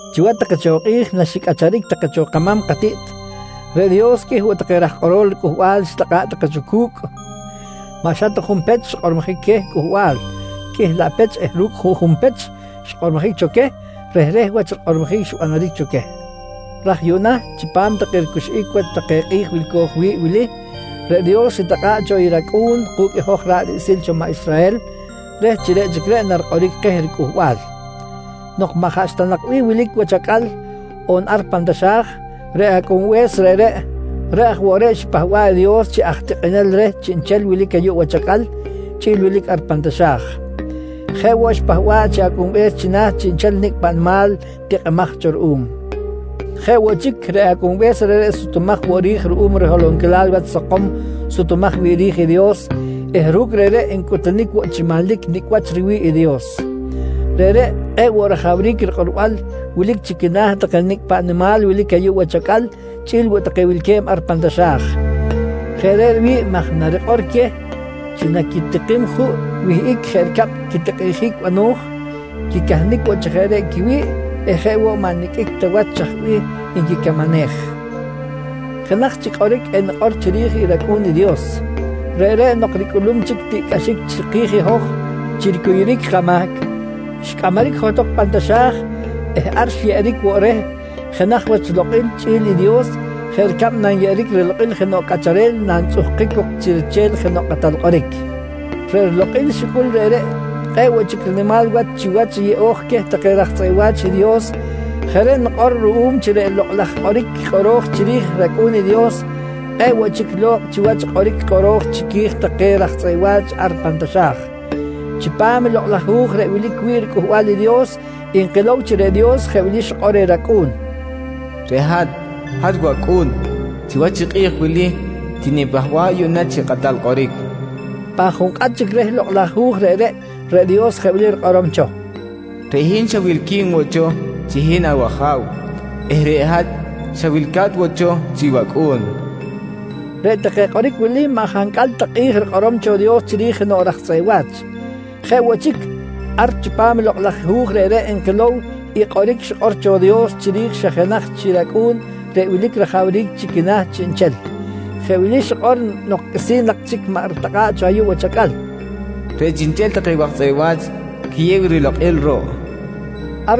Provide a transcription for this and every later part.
Chiwach take cho kꞌi̱j naxicꞌacharic take cho kama̱m katiꞌt, reꞌ Dios qꞌuih woꞌ take raj kꞌorol ricꞌuhbal xitakꞌa̱ꞌ take cho cu̱cꞌ. Maꞌ xa ta junpech xkꞌormojic queh cꞌuhbal, qꞌuih laꞌ pech eh ru̱cꞌ juꞌjun pech xkꞌormojic cho queh, rehreh wach rikꞌormojic xbanaric cho queh. Raj yuꞌna chipam take ricuxꞌic wach take kꞌi̱j wilco̱j wi̱ꞌ wili, reꞌ Dios xitakꞌa̱ꞌ cho i rAcꞌu̱n ku̱cꞌ i hoj ra̱ꞌ riꞌsil cho maꞌ Israhel reh chi reꞌ chic reꞌ narikꞌoric keh riCꞌuhbal. Nok maꞌ jaꞌxta nak bih wilic wach acꞌal on ar pan taxa̱j, reꞌ Acꞌunbe̱s reꞌreꞌ, reꞌ aj woꞌ reꞌ xipahba̱ꞌ i Dios chi aj tikꞌinel reh chiꞌnchel wilic ayuꞌ wach acꞌal chꞌi̱l wilic ar pan taxa̱j. Jeꞌ woꞌ xipahba̱ꞌ chi Ajabe̱s china̱ chiꞌnchel nicꞌ paꞌ nimal tikꞌimaj cho ruꞌum. Jeꞌ woꞌ chic, reꞌ Acꞌunbe̱s reꞌreꞌ sutumaj woꞌ ri̱j ru̱cꞌ riholonquilal wach sakom sutumaj wi̱ꞌ ri̱j i Dios eh ru̱cꞌ reꞌreꞌ ncꞌutunic woꞌ chi manlic nicꞌ wach riwi̱ꞌ i Dios. Reꞌreꞌ kꞌe̱ꞌ woꞌ rajawric rikꞌorbal wilic chi quina̱ take nicꞌ paꞌ nimal wilic ayuꞌ wach acꞌal chꞌi̱l woꞌ take wilque̱b ar pan taxa̱j. Jeꞌ reꞌ riwi̱ꞌ maj narikꞌor queh chi naquitikim juꞌ wihꞌic jeꞌ ricab quitikꞌinjic bano̱j, quicahnic woꞌ chi jeꞌ reꞌ quiwi̱ꞌ eh jeꞌ woꞌ maꞌ niqꞌuic ta wach chaj bih nquicamanej. Jenaj chic kꞌoric enikꞌor chiri̱j rAcꞌu̱n i Dios. Reꞌreꞌ nok ricꞌulum chic tiꞌcꞌaxic chiki̱j i hoj chi ricuyuric kamahc, xcꞌamaric johtok pan taxa̱j eh ar xyeꞌeric woꞌ reh jenaj wach lokꞌil chꞌi̱l i Dios jeꞌ ricab nanyeꞌeric rilokꞌil jenoꞌ cꞌacharel nantzꞌuhkic cok chi riche̱l jenoꞌ kꞌatal kꞌoric. Reꞌ rilokꞌil xicꞌul reꞌreꞌ, kꞌe̱ꞌ woꞌ chic rinimal wach chiwach i yeꞌo̱j queh take raj tzꞌeꞌ wa̱ch i Dios. Jeꞌ reꞌ nikꞌor ruꞌum chi reꞌ lokꞌ laj kꞌoric kꞌoro̱j chiri̱j rAcꞌu̱n i Dios, kꞌe̱ꞌ woꞌ chic lo̱kꞌ chiwach i kꞌoric kꞌoro̱j chiqui̱j take raj tzꞌeꞌ wa̱ch ar pan taxa̱j. Chipam i lokꞌ laj hu̱j reꞌ wilic wi̱ꞌ riCꞌuhbal i Dios nkilow chi reꞌ Dios jeꞌ wili xikꞌor reh rAcꞌu̱n: “Reꞌ hat, hat wacꞌu̱n. Chiwach i kꞌi̱j wili tinipahba̱ꞌ yuꞌna chi kꞌatal kꞌoric, nqui reh. Pan junkꞌat chic reh Lokꞌ laj Hu̱j reꞌreꞌ, reꞌ Dios jeꞌ wili rikꞌorom cho: “Reꞌ hin xa wilqui̱n woꞌ cho chi hin awaja̱w eh reꞌ hat xa wilca̱t woꞌ cho chi wacꞌu̱n, nqui reh. Reꞌ take kꞌoric wili maꞌ jancꞌal ta kꞌi̱j rikꞌorom cho Dios chiri̱j jenoꞌ raj tzꞌeꞌ wa̱ch. Jeꞌ woꞌ chic, ar chipam i lokꞌ laj hu̱j reꞌreꞌ nkilow i kꞌoric xikꞌor cho i Dios chiri̱j i xa jenaj chi rAcꞌu̱n reꞌ wilic rajawric chi quina̱ chiꞌnchel. Jeꞌ wili xikꞌor nok qꞌuisi̱n maꞌ chic ritakꞌa̱ꞌ cho ayuꞌ wach acꞌal: “Reꞌ chiꞌnchel take waj tzꞌeꞌ wa̱ch quiyew rilokꞌil ruꞌ, nqui xikꞌor.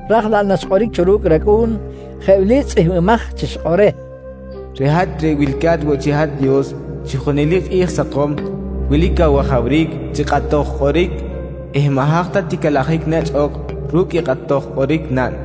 Ra̱j laꞌ naxkꞌoric cho ru̱cꞌ rAcꞌu̱n, jeꞌ wili tzꞌihmbimaj chi xikꞌor reh: “Reꞌ hat reꞌ wilca̱t woꞌ chi hat Dios chi junelic kꞌi̱j sakom, wilic awajawric chi kꞌatoj kꞌoric eh maꞌ haj ta ticalajic nechꞌ ok ru̱cꞌ i kꞌatoj kꞌoric naꞌn.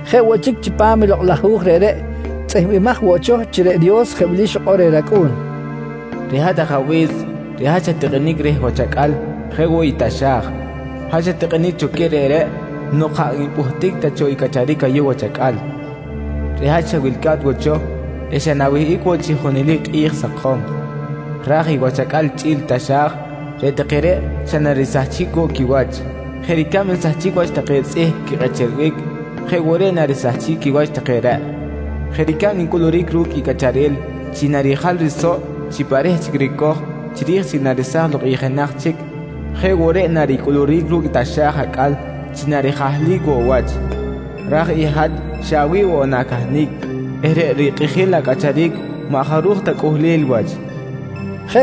Jeꞌ woꞌ chic chipam i lokꞌ laj hu̱j reꞌreꞌ, tzꞌihmbimaj woꞌ cho chi reꞌ Dios jeꞌ wili xikꞌor reh rAcꞌu̱n: Reꞌ hat Ajabe̱s, reꞌ hat xat-tikꞌinic reh wach acꞌal jeꞌ woꞌ i taxa̱j. Hat xat-tikꞌinic cho queh reꞌreꞌ nok jaꞌ npꞌuhtic ta cho i cꞌacharic ayuꞌ wach acꞌal. Reꞌ hat xa wilca̱t woꞌ cho eh xa na̱wihꞌic woꞌ chi junelic kꞌi̱j sakom. Raj i wach acꞌal chꞌi̱l i taxa̱j, reꞌ take reꞌ xa narisahchic woꞌ quiwach. Jeꞌ ricab nsahchic wach take tzꞌih quikꞌecherbic, jeꞌ woꞌ reꞌ narisahchic quiwach take reꞌ. Jeꞌ ricab ncꞌuluric ru̱cꞌ i cꞌacharel chi narijal risoꞌ chi pa reh chic ricoj chiri̱j naresaj lok i jenaj chic, jeꞌ woꞌ reꞌ naricꞌuluric ru̱cꞌ taxa̱j acꞌal chi narijahlic woꞌ wach. Raj i hat xa awi̱ꞌ woꞌ na̱cahnic eh reꞌ rikꞌijil acꞌacharic maꞌ jaruj ta cꞌuhlel wach, nqui Dios.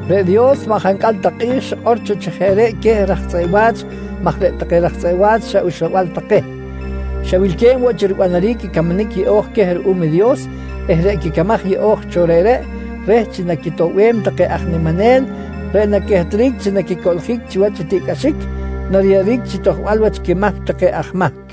Reꞌ Dios maꞌ jancꞌal ta kꞌi̱j xikꞌor cho chi jeꞌ reꞌ queh raj tzꞌeꞌ wa̱ch maj reꞌ take raj tzꞌeꞌ wa̱ch xa uxlabal take, xa wilque̱b woꞌ chi ribanaric i camanic yeꞌo̱j queh ruꞌum i Dios eh reꞌ quicamaj yeꞌo̱j cho reꞌreꞌ, reh chi naquitoꞌbem take aj niminel reꞌ naquehtric chi naquicoꞌljic chiwach i tiꞌcꞌaxic nariyeꞌeric chi tojbal wach quimahc take aj mahc.